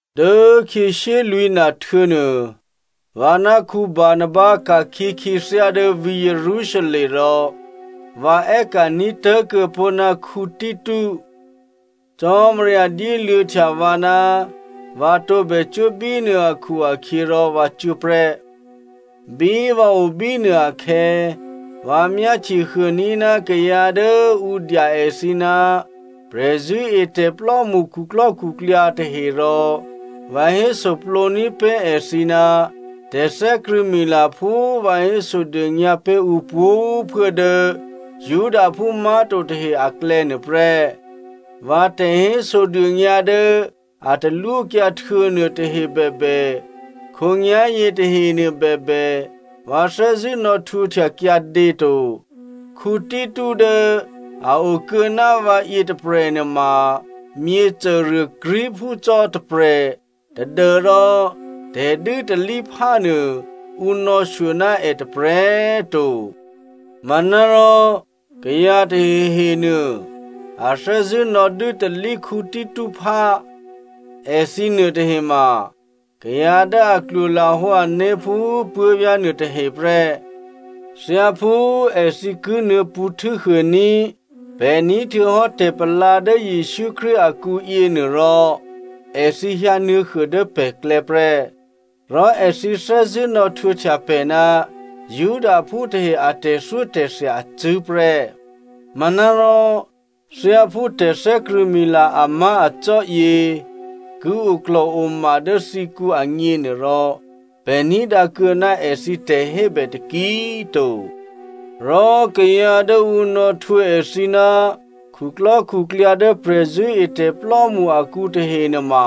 Dố khyě shyélwǐ̤na htuô̌nuô vǎ ná Barnaba ka̤khyě khyěthyá dố vǐ̤ Jerusalem rò vǎ è́ka̤ní̤ tố̤kuô̌ pó̤ ná Tito. Cò́marya dyéluô̌htya vǎ ná vǎ tǒbè cuố bínuô akhu-akhyěrò vǎ cuố prè́. Bí vǎ o bínuô akhè̌, vǎ myáhtyehuôní̤ ná kayǎ dố ǔ dya èthǐ ná prè̤zṳ̂́etè̤plò́mṳ khuklò́khuklyǎ tahe rò vǎ hésoplǒní̤ pé̤ èthǐ ná tè̤thè́krṳ̂̌mila phú vǎ hésodônyǎ pé̤ ǔ pwǒ̤꤮ phuố dố Judaphú má̤to tahe aklè̌ nuôprè́. Vǎ tè̤hésodônyǎ dố a talwókyǎ htuô̌nuô tahe bèbè, khǒnyá̤yě tahenuô bèbè, vǎ thè́zṳ̂́ nò̌htwǒhtya kyǎdě to. Tito dố a okuô̌ ná vǎ yětôprè̤ nuôma myěcôruô Greekphú cò́ tôprè̤ tadû́rò tè̤dû́talíphá nuô, ǔ nò̌shyo ná è tôprè̤꤮ to. Manárò kayǎ tahehenuô a thè́zṳ̂́ nò̌dû́talí Tito phá. Èthǐ nuôtahe ma kayǎ dố a klwolahǒ ané̤ phú puố̤vyá̤ nuôtahe prè́. Thyáphú èthǐ ki nuô̌pṳ̌ htû́huôní̤ pè̤ ní̤ htuô̌hò́ tè̤palǎ dố Jesǔ Krístu akǔ yěnuôrò èthǐ hyǎnuô̌huô dố pè̤klè̌ prè́. Rò èthǐ thè́zṳ̂́ nò̌htwǒhtya pè̤ ná Judaphú tahe a tè̤thyótè̤thya acṳ̂́ prè́. Manárò thyáphú tè̤thè́krṳ̂̌mila amá̤acò́ yě ki oklò̤oma dố thǐkǔ agněnuôrò, pè̤ ní̤dǎ kuô̌ ná èthǐ tè̤hébè taki꤮ to. Rò kayǎ dố ǔ nò̌htwǒ èthǐ ná khuklò́khuklyǎ dố prè̤zṳ̂́etè̤plò́mṳ akǔ tahe nuôma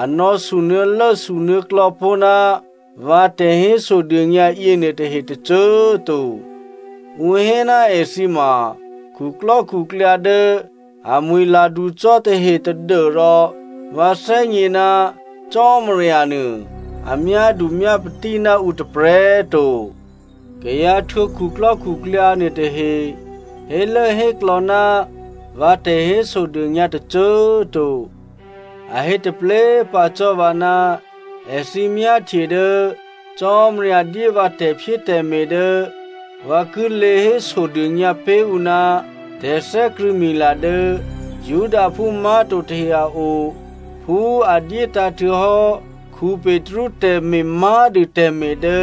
a nò̌sunuô̌lố sunuô̌klò̌ pó̤ ná vǎ tè̤hésodônyǎ yěnuôtahe tôcô꤮ to. Ǔ hé ná èthǐ ma khuklò́khuklyǎ dố amwi̤ladu cò́ tahe tadû́rò vǎ thè́gně ná Cò́marya nuô a myádu myápatí ná ǔ tôprè̤꤮ to. Kayǎ htwǒ khuklò́khuklyǎ nuôtahe hélốhéklò̌ ná vǎ tè̤hésodônyǎ tôcô꤮ to. A hé taplé꤮ pǎ cò́ vǎ, èthǐ myáhtye dố Cò́marya dyé vǎ tè̤phyétè̤me̤ dố vǎ ki lě hésodônyǎ pé̤ ǔ ná tè̤thè́krṳ̂̌mila dố Judaphú má̤to tahe a o phú a dyétǎ̤ htuô̌hò́ Petru tè̤me̤ má̤dû tè̤me̤ dố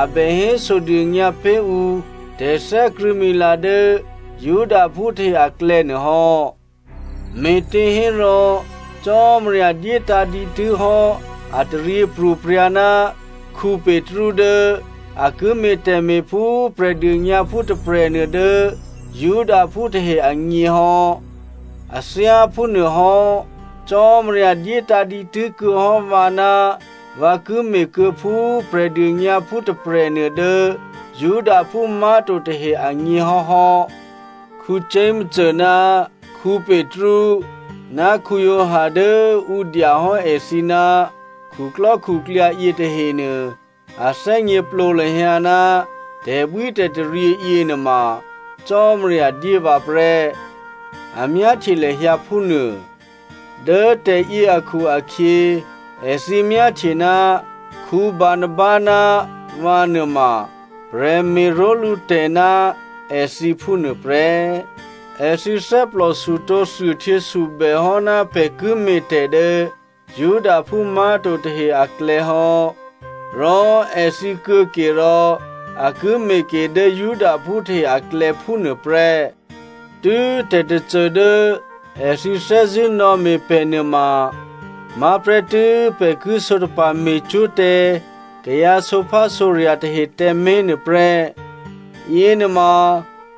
a bè hésodônyǎ pé̤ ǔ tè̤thè́krṳ̂̌mila dố Judaphú tahe aklè̌ nuô hò́. Me̤těhérò Cò́marya dyétǎ̤ dǐtû́ hò́ a taryěpro̤prya̤ ná Petru dố a ki me̤ tè̤me̤ phú Prè̤dônyǎphú tôprè̤nuô dố Judaphú tahe agněhò́. A thyá phúnuôhò́ Cò́marya dyétǎ̤ dǐtû́ kuô̌hò́ vǎ ná vǎ ki me̤kuô̌phú Prè̤dônyǎphú tôprè̤nuô dố Judaphú má̤to tahe agně hò́hò́. Jakomo ná Petru ná Giovanni dố ǔ dya hò́ èthǐ ná khuklò́khuklyǎ yětahenuô, a thè́gněplǒ lahyǎ ná tè̤bwítè̤taryě yěnuôma Cò́marya dyé vǎ prè́, a myáhtye lahyǎ phúnuô. Dố tè̤yě akhu-akhyě, èthǐ myáhtye ná Barnaba ná vǎ nuôma prè̤me̤ró̤lǔtè̤ ná èthǐ phúnuô prè́. Èthǐ thè́plòsutǒ thuôhtyěsubè hò́ ná pè̤ ki me̤tè̤ dố Judaphú má̤to tahe aklè̌hò́, rò èthǐ kuô̌ke rò a ki me̤ ke dố Judaphú tahe aklè̌ phúnuô prè́. Tû́ tè̤tôcô dố èthǐ thè́zṳ̂́ nò̌me̤ pè̤ nuôma má̤prè́tû́ pè̤ ki sǒtapa̤ me̤cwó̤ tǎ kayǎ sǒphásǒrya̤ tahe tǎmé̤ nuôprè́. Yěnuôma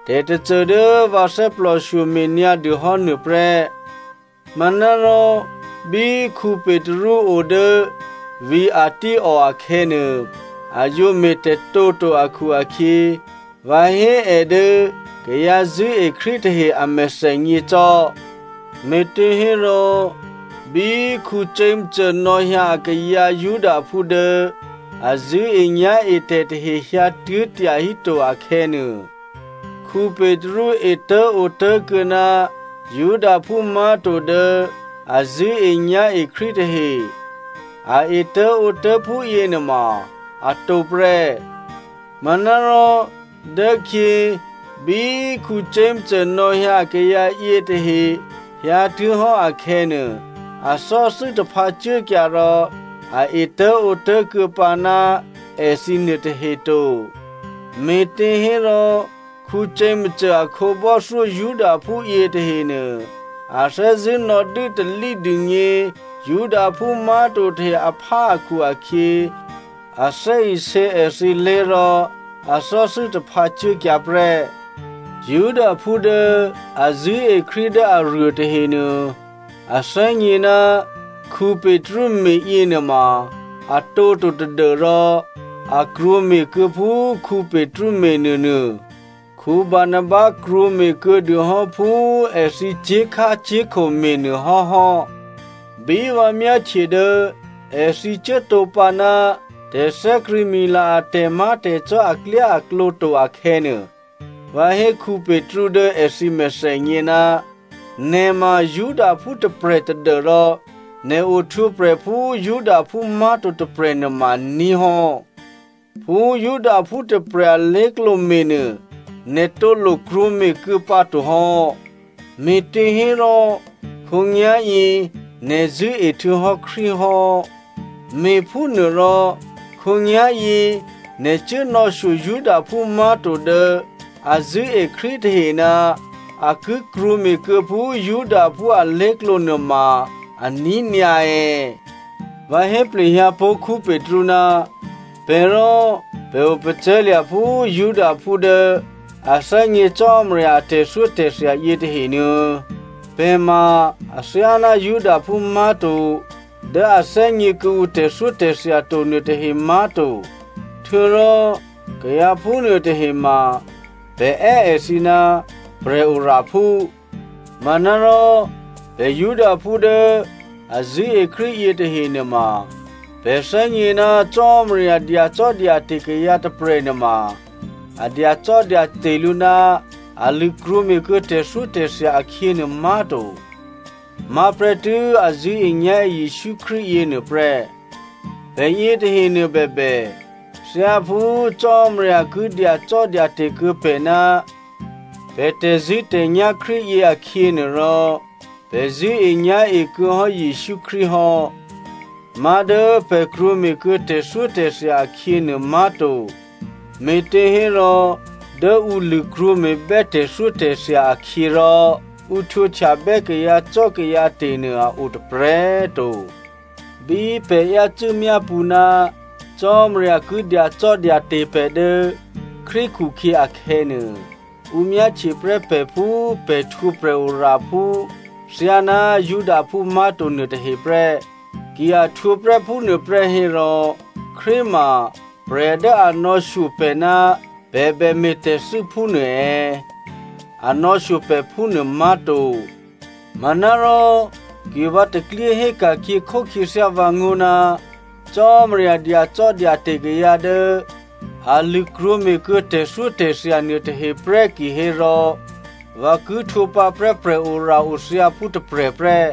tè̤tôcô dố vǎ thè́plòshyo me̤nyǎ dûhò́ nuôprè́. Manárò bí Petru o dố vǐ̤ Antioko akhè̌nuô, a yǒ me̤tè̤tǒto akhu-akhyě vǎ hé è dố kayǎ zṳ̂́e Krístu tahe a mèthènyě cò́. Me̤těhérò bí Jakomo nò̌hyǎ akayǎ Judaphú dố a zṳ̂́enyá̤etè̤ tahe hyǎtuố̤ tyahíto akhè̌nuô, Petru etố̤ǒtố̤kuô̌ ná Judaphú má̤to dố a zṳ̂́enyá̤e Krístu tahe. A etố̤ǒtố̤ phúyěnuôma atǒ prè́. Manárò dốkhyě, bí Jakomo nò̌hyǎ akayǎ yětahe hyǎtuố̤hò́ akhè̌nuô, a thò́thû́ taphǎ cuốkyǎ rò a etố̤ǒtố̤kuô̌ pǎ ná èthǐ nuôtahe to, me̤těhérò Jakomo a khǒbò́thyó Judaphú yětahenuô, a thè́zṳ̂́ nò̌dû́talí dûgně Judaphú má̤to tahe aphá akhu-akhyě, a thè́isě èthǐlé̤ rò a thò́thû́ taphǎ cuốkyǎ prè́. Judaphú dố a zṳ̂́e Krístu dố aruô tahenuô a thè́gně ná Petru me̤ yěnuôma a tǒto tadû́rò a krwǒme̤kuô̌ phú Petru me̤nuônuô. Barnaba krwǒme̤kuô̌ dûhò́ phú èthǐ cyé̤khácyé̤kho me̤nuô hò́hò́. Bí vǎ myáhtye dố èthǐ cuốtǒ pǎ ná tè̤thè́krṳ̂̌mila a tè̤má̤tè̤cò́ aklyáaklǒ to akhè̌nuô, vǎ hé Petru dố èthǐ mèthènyě, “Nè̤ ma Judaphú tôprè̤ tadû́rò nè̤ ohtwǒprè̤ phú Judaphú má̤to tôprè̤ nuôma aní̤ hò́. Phú Judaphú tôprè̤ alé̤klǒ me̤nuô, nè̤ tǒ lokrwǒ me̤kuô̌ pǎtohò́, me̤těhérò khǒnyá̤yě nè̤ zṳ̂́e htuô̌hò́ Krístu hò́. Me̤phúnuôrò khǒnyá̤yě nè̤ cuố nò̌shyo Judaphú má̤to dố a zṳ̂́e Krístu tahe ná a ki krwǒme̤kuô̌ phú Judaphú alé̤klǒ nuôma aní̤ nyǎ è̌?” Vǎ hé plehyǎpó̤ Petru, “Pè̤ rò pè̤ opacè̤̌lya̤ phú Judaphú dố a thè́gně Cò́marya a tè̤thyótè̤thya yětahenuô̌. Pè̤ ma athyáná Judaphú má̤to dố a thè́gně kuô̌ǔ tè̤thyótè̤thya to nuôtahe má̤to. Htuô̌rò kayǎ phúnuô tahe ma pè̤ è́ èthǐ ná prè̤oraphú. Manárò pè̤ Judaphú dố a zṳ̂́e Krístu yětahe nuôma, pè̤ thè́gně ná Cò́marya dyacò́dyate̤ kayǎ tôprè̤nuôma a dyacò́dyate̤ lǔ ná a lṳ̂krwǒ me̤kuô̌ tè̤thyótè̤thya akhyěnuô má̤to. Má̤prè́ tû́ a zṳ̂́enyá̤e Jesǔ Krístu yěnuô prè́. Pè̤ yětahenuô bèbè, thyáphú Cò́marya ki dyacò́dyate̤ kuô̌ pè̤ ná pè̤ tè̤zṳ̂́tè̤nyá̤ Krístu yě akhyě nuôrò, pè̤ zṳ̂́enyá̤e kuô̌hò́ Jesǔ Krístu hò́. Má̤ dố pè̤ krwǒme̤kuô̌ tè̤thyótè̤thya akhyěnuô má̤to, me̤těhérò dố ǔ lṳ̂krwǒ me̤bè́ tè̤thyótè̤thya akhyě rò ǔ htwǒhtyabè́ kayǎcò́kayǎte̤ nuô a o tôprè̤꤮ to. “Bí pè̤ yácû́ myápṳ̌ ná Cò́marya ki dyacò́dyate̤ pè̤ dố Krístu khukhyě akhè̌nuô, ǔ myáhtye prè́ pè̤ phú pè̤ htwǒ prè̤oraphú thyáná Judaphú má̤to nuôtahe prè́. Ki a htwǒprè́ phúnuôprè́ hérò, Krístu ma prè̤ dố a nò̌shyo pè̤ ná pè̤ bè me̤tè̤thû́ phúnuô è̌? A nò̌shyo pè̤ phúnuô má̤to. Manárò ki vǎ taklyé hé ka̤khyěkhó khyěthyá vǎngó̤ ná Cò́marya dyacò́dyate̤ kayǎ dố a lṳ̂krwǒme̤ kuô̌ tè̤thyótè̤thya nuôtahe prè́ kihérò vǎ ki htwǒ pǎprè́ prè̤ora-othyǎphú tôprè̤ prè́.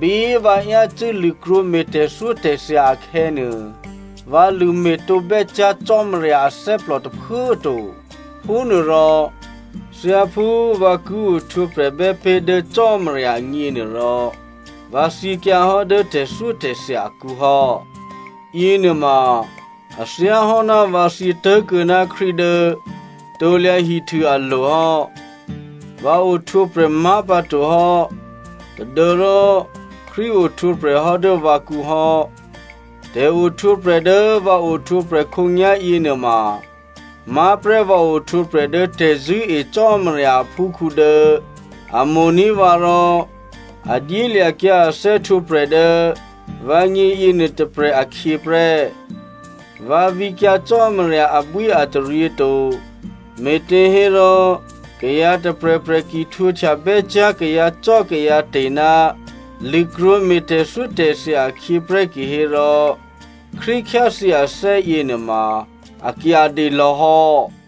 Bí vǎ yácû́ lṳ̂krwǒme̤ tè̤thyótè̤thya akhè̌nuô, vǎ lṳ̂ me̤tǒ bè́cyá̤ Cò́marya athè́plò tôphuố꤮ to. Phúnuôrò thyáphú vǎ ki ohtwǒprè̤bè́ pé̤ dố Cò́marya agněnuôrò, vǎ thyěkyǎhò́ dố tè̤thyótè̤thya akǔ hò́. Yěnuôma a thyáhò́ ná vǎ thyě tố̤kuô̌ ná Krístu dố krusu alo̤ hò́. Vǎ ohtwǒprè̤ má̤pǎto hò́ tadû́rò Krístu ohtwǒprè̤ hò́ dố vǎkǔ hò́. Tè̤ohtwǒprè̤ dố vǎ ohtwǒprè̤ khǒnyá̤ yěnuôma má̤prè́ vǎ ohtwǒprè̤ dố tè̤zṳ̂́e Cò́marya aphúkhǔ dố a mo̤ní̤ vǎ rò a dyélya̤kyǎ a thè́htwǒprè̤ dố vǎgně yěnuô tôprè̤ akhyě prè́. Vǎ vǐkyǎ Cò́marya abwíataryě to, me̤těhérò kayǎ tôprè̤prè̤ ki htwǒhtya bè́cyá̤ kayǎcò́kayǎte̤ ná lṳ̂krwǒme̤ tè̤thyótè̤thya akhyě prè́ kihérò, Krístu khyáthyě athè́ yěnuôma a kyǎdě lò̌hò́.”